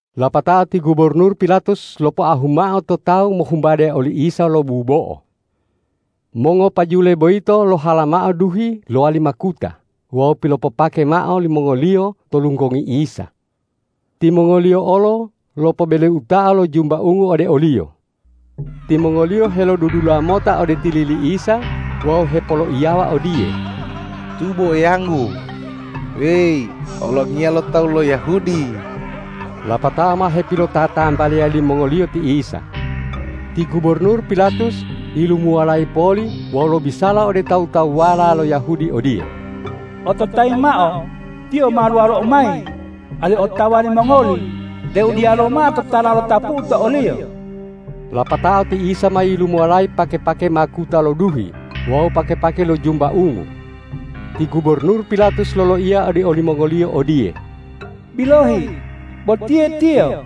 Lapatao ti gubornur Pilatus lopoahu mao to tawu mohumbade oli Isa lo bubo'o. Mongopajule boyito lohalamao duhi lowali makuta wawu pilopopake mao limongoliyo to lunggongi Isa. Timongoliyo olo lopobeleutao lo jumba ungu ode o-Liyo. Timongoliyo helolodudula mota ode tili li Isa wawu hepoloiyawa odiye,”Tubo Eyanggu weyi olongiya lo tawu lo Yahudi!” Lapatao ma hepilotatambaliya limongoliyo ti Isa. Ti gubornur Pilatus yilumuwalayi poli wawu lobisala ode tawu-tawuwala lo Yahudi odiye,”Ototayi mao, Tiyo ma luwalou mayi, alihu otawa limongoli deu diyalu mao totala lotapu'u to o-Liyo.” Lapatao ti Isa ma yilumuwalayi pake-pake makuta lo duhi wawu pake-pake lo jumba ungu. Ti gubornur Pilatus loloiya ode olimongoliyo odiye,”Bilohi, botiye Tiyo!”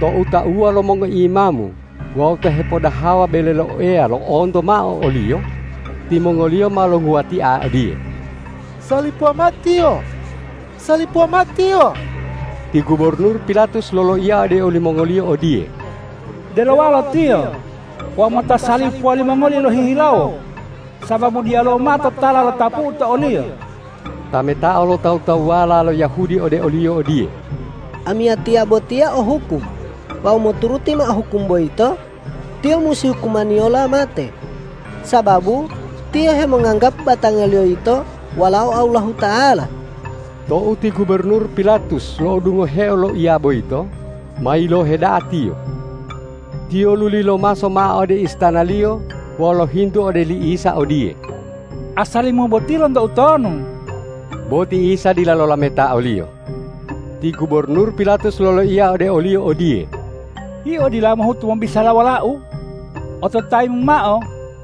Tou tauwa lo mongoimamu wawu ta hepodahawa bele lo Eya lo'onto mao o-Liyo, timongoliyo ma longuwatia odiye,”Salipuwa mao Tiyo! Salipuwa mao Tiyo!” Ti gubornur Pilatus loloiya ode olimongoliyo odiye,”Delowalo Tiyo wawu mota salipuwa limongoli lohihilawo, sababu diyalu mao totala lotapu'u to o-Liyo.” Tametao lo tawu-tawuwala lo Yahudi ode oliyo odiye,”Amiyatiya botiya o hukum wawu moturuti mao hukum boyito, Tiyo musi hukumaniyola mate, sababu Tiyo hemonganggapu batangaLiyo yito Walao Allahuta'ala.” Tou ti gubornur Pilatus lo'odungoheo loiya boyito, ma yilohe da'a tiyo. Tiyo luli lomaso mao ode istanaliyo wawu lohintu ode li Isa odiye,”Asali-Mu boti lonto utonu?” Bo ti Isa dila lolameta oliyo. Ti gubornur Pilatus loloiya ode o-Liyo odiye,”Yio dila mohuto mobisala wolau. Ototayi-Mu mao,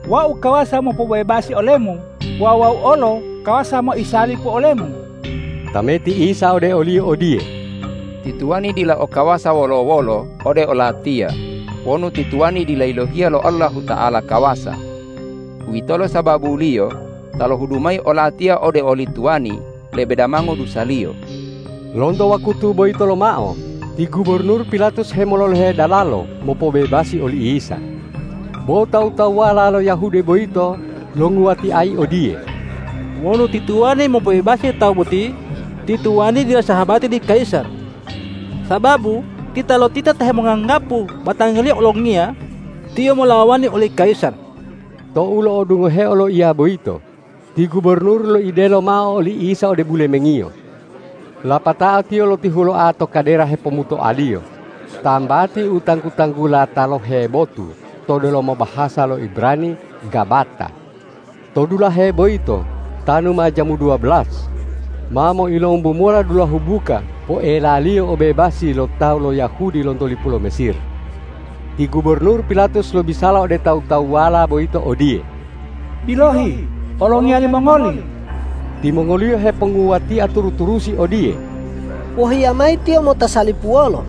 wau kawasa mopobebasi ole-Mu wawu wau olo kawasa moisalipu ole-Mu!” Tameti Isa ode oliyo odiye,”Ti tuwani dila o kawasa wolo-wolo ode o-Latiya wonu ti tuwani dila yilohiya lo Allahuta'ala kawasa. Uwitolo sababuliyo ta lohudu mayi o-Latiya ode oli tuwani lebe damango dusaliyo.” Lonto wakutu boyito lomao ti gubornur Pilatus hemololohe dalalo mopobebasi oli Isa. Bo tawu-tawuwala lo Yahudi boyito longuwatiayi odiye,”Wonu ti tuwani mopobebasi Tawu boti, ti tuwani dila sahabati li kayisar! Sababu titalotita ta hemonganggapu batangaliyo olongiya, tiyo molawani oli kayisar!” Tou lo'odungoheo loiya boyito, ti gubornur loidelo mao oli Isa ode bulemengiyo. Lapatao tiyo lotihuloa to kadera hepomutoaliyo, tambati u tanggu-tanggula talohe botu to delomo bahasa lo Ibrani Gabata. To dulahe boyito tanu ma jamu duwabelas, ma moilombu mola dulahu buka poelaliyo obebasi lo tawu lo Yahudi lonto lipu lo Mesir. Ti gubornur Pilatus lobisala ode tawu-tawuwala boyito odiye,”Bilohi, olongiya limongoli!” Timongoliyo heponguwatia turu-turusi odiye,”Wohiya mayi Tiyo mota salipuwolo!”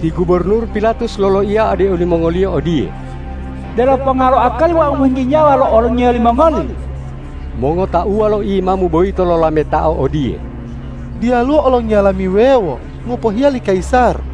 Ti gubornur Pilatus loloiya ode olimongoliyo odiye,”Delo ponga lo akali wau mohinggi nyawa lo olongiya limongoli?” Mongotauwa lo imamu boyito lolametao odiye,”Diyaluwo olongiya lami wuwewo ngopohiya li kayisar!”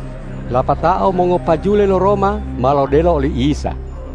Lapatao mongopajule lo Roma ma lodelo oli Isa.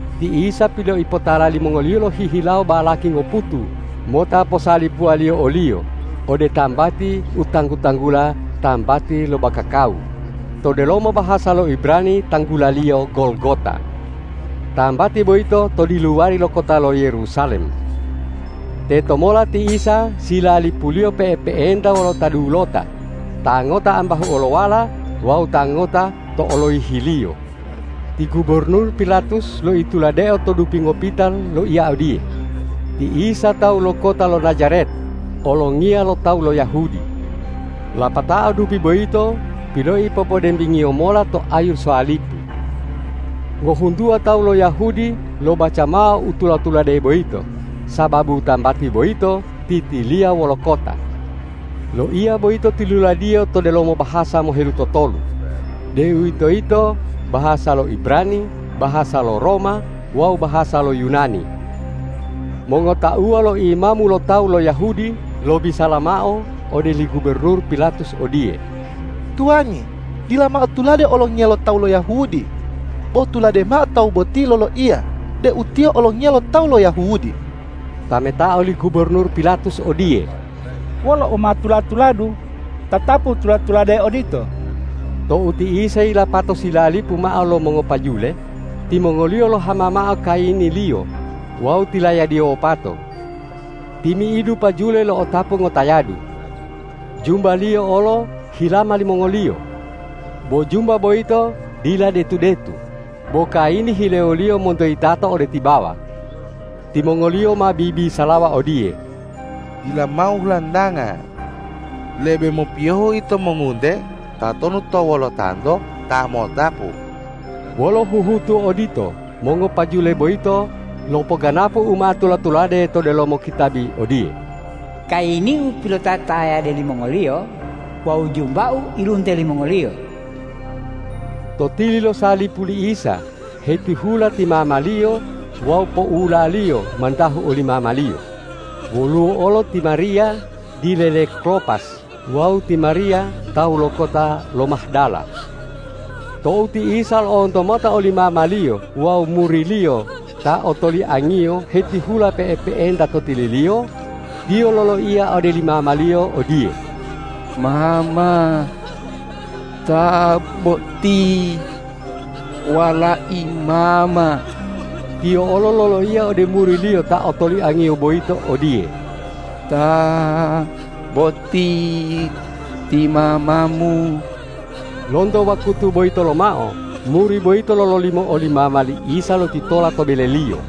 Ti Isa piloipotala limongoliyo lohihilawo balaki ngoputu mota posalipuwaliyo o-Liyo ode tambati u tanggu-tanggula Tambati lo Bakakawu, to delomo bahasa lo Ibrani tanggulaliyo Golgota. Tambati boyito to diluwari lo kota lo Yerusalem. Tetomola ti Isa silalipuliyo pe'epe'enta wolo ta dulota, ta ngota ambahu olowala wawu ta ngota to oloyihiliyo. Ti gubornur Pilatus loituladeo to dupi ngopita loiya odiye,”Ti Isa tawu lo kota lo Najaret, olongiya lo tawu lo Yahudi.” Lapatao dupi boyito piloipopodembingiyo mola to ayu salipu. Ngohuntuwa tawu lo Yahudi lobaca mao u tula-tulade boyito, sababu tambati boyito titiliya wolo kota. Loiya boyito tiluladiyo to delomo bahasa mohelutotolu, deuwitoyito bahasa lo Ibrani, bahasa lo Roma wawu bahasa lo Yunani. Mongotauwa lo imamu lo tawu lo Yahudi lobisala mao ode li gubornur Pilatus odiye,”Tuwani, dila mao tulade olongiya lo tawu Yahudi, bo tulade mao Tawu boti loloiya deu Tiyo olongiya lo tawu lo Yahudi.” Tametao li gubornur Pilatus odiye,”Wolo u ma tula-tuladu, tatapu tula-tulade odito.” Tou ti Isa yilapato silalipu mao lo mongopajule, timongoliyo lohama mao kayini-Liyo wawu tilayadiyo wopato. Timi'idu pajule lo'otapu ngotayadu. Jumba-Liyo olo hilama limongoliyo. Bo jumba boyito dila detu-detu, bo kayini hilewoliyo monto yitato ode tibawa. Timongoliyo ma bibisalawa odiye,”Dila mao hulantanga. Lebe mopiyohu ito mongunte tatonu to wolotanto ta mo'otapu.” Wolo huhutu odito mongopajule boyito lopoganapu u ma tula-tulade to delomo kitabi odiye,”Kayini-U pilotatayade limongoliyo wawu jumba-U ilunte limongoliyo.” To tili lo salipu li Isa hetihula ti mama-Liyo wawu poula-Liyo mantahu oli mama-Liyo, woluwo olo ti Mariya dile le Klopas wawu ti Mariya tawu lo kota lo Mahdala. Tou ti Isa lo'onto mota oli mama-Liyo wawu muri-Liyo ta otoliang-Iyo hetihula pe'epe'enta to tili-Liyo, Tiyo loloiya ode li mama-Liyo odiye,”Mama, ta boti walai mama!” Tiyo olo loloiya ode muri-Liyo ta otoliang-Iyo boyito odiye,”Ta boti ti mamamu!” Lonto wakutu boyito lomao muri boyito lololimo oli mama li Isa lotitola to beleliyo.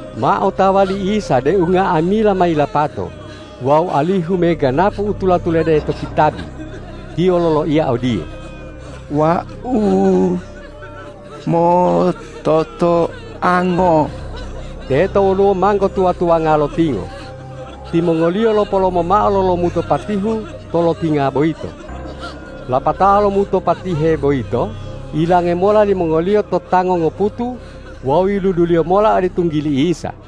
Ma otawa li Isa deu nga'amila ma yilapato wawu alihu meganapu u tula-tulade to kitabi, Tiyo loloiya odiye,”Wau mototoango!” Teto woluwo manggo tuwa-tuwanga lotingo. Timongoliyo lopolomo mao lo lomuto patihu to lotinga boyito. Lapatao lomuto patihe boyito yilange mola limongoliyo to tango ngoputu wawu yiluduliyo mola ode tunggili Isa.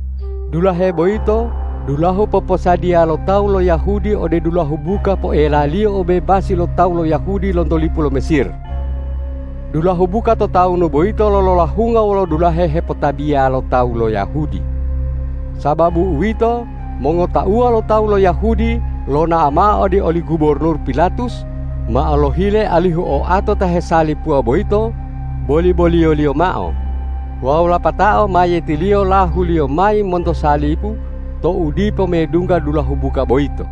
Dulahe boyito dulahu poposadiya lo tawu lo Yahudi ode dulahu buka poelaliyo obebasi lo tawu lo Yahudi lonto lipu lo Mesir. Dulahu buka to tawunu boyito lololahunga wolo dulahe hepotabiya lo tawu lo Yahudi. Sababu uwito, mongotauwa lo tawu lo Yahudi lonao mao ode oli gubornur Pilatus mao lohile alihu oato ta hesalipuwa boyito boli-boliyoliyo mao wawu lapatao mayiyetiliyo lahuliyo mayi monto salipu tou dipo medungga dulahu buka boyito.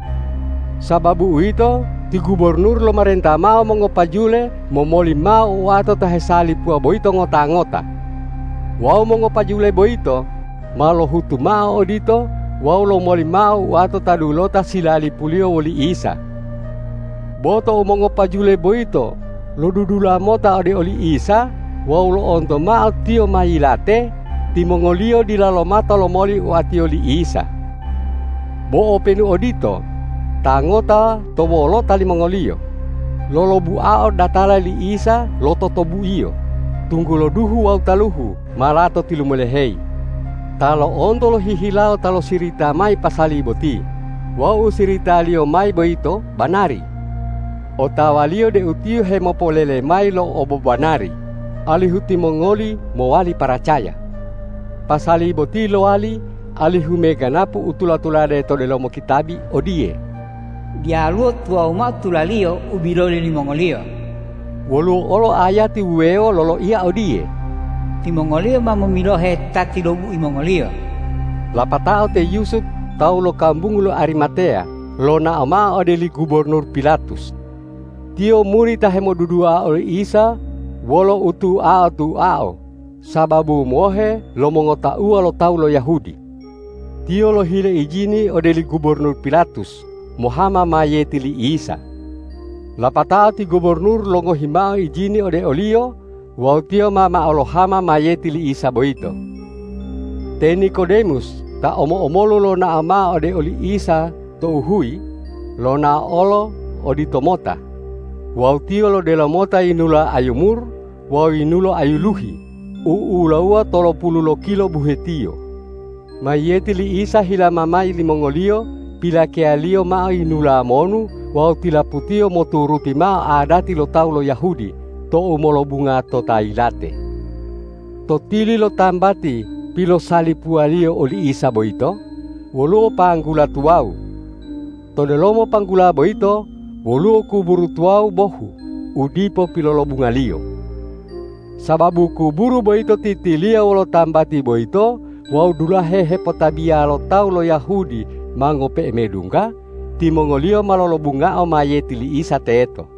Sababu uwito, ti gubornur lomarenta mao mongopajule momoli mao oato ta hesalipuwa boyito ngota-ngota. Wawu mongopajule boyito ma lohutu mao odito wawu lomoli mao oato ta dulota silalipuliyo woli Isa. Bo tou mongopajule boyito lodudula mota ode oli Isa wawu lo'onto mao Tiyo ma yilate, timongoliyo dila lomata lomoli oatiyo li Isa. Bo openu odito, ta ngota to wolota limongoliyo, lolobuao datala li Isa lo totobuiyo, tunggulo duhu wawu taluhu ma lato tilumoloheyi. Ta lo'onto lohihilawo ta losirita mayi pasali boti wawu u siritaliyo mayi boyito banari. Otawaliyo deu tiyo hemopolele mayi lo obobanari, alihu timongoli mowali paracaya. Pasali boti lowali alihu meganapu u tula-tulade to delomo kitabi odiye,”Diyaluwo tuwawu mao tula-Liyo u biloli limongoliyo.” Woluwo olo ayati wuwewo loloiya odiye,”Timongoliyo ma momilohe ta tilobui mongoliyo.” Lapatao te Yusup tawu lo kambungu lo Arimateya lonao mao ode li gubornur Pilatus. Tiyo muri ta hemodudua oli Isa wolo utuao-tuao sababu mohe lo mongotauwa lo tawu lo Yahudi. Tiyo lohile ijini ode li gubornur Pilatus, mohama mayiyeti li Isa. Lapatao ti gubornur longohi mao ijini ode oliyo wawu tiyo ma mao lohama mayiyeti li Isa boyito. Te Nikodemus ta omo-omolu lonao mao ode oli Isa tou huyi, lonao olo oditomota wawu tiyo lodelo mota yinulo ayu mur wawu yinulo ayu luhi u'ulawuwa tolopulu lokilo buhetiyo. Mayiyeti li Isa hilama mayi limongoliyo pilakeyaliyo mao yinula monu wawu tilaputiyo moturuti mao adati lo tawu lo Yahudi tou molobunga to ta yilate. To tili lo tambati pilosalipuwaliyo oli Isa boyito, woluwo panggula tuwawu. To delomo panggula boyito woluwo kuburu tuwawu bohu u dipo pilolobungaliyo. Sababu kuburu boyito titiliya wolo tambati boyito wawu dulahe hepotabiya lo tawu lo Yahudi ma ngope'e medungga, timongoliyo ma lolobungao mayiyeti li Isa teto.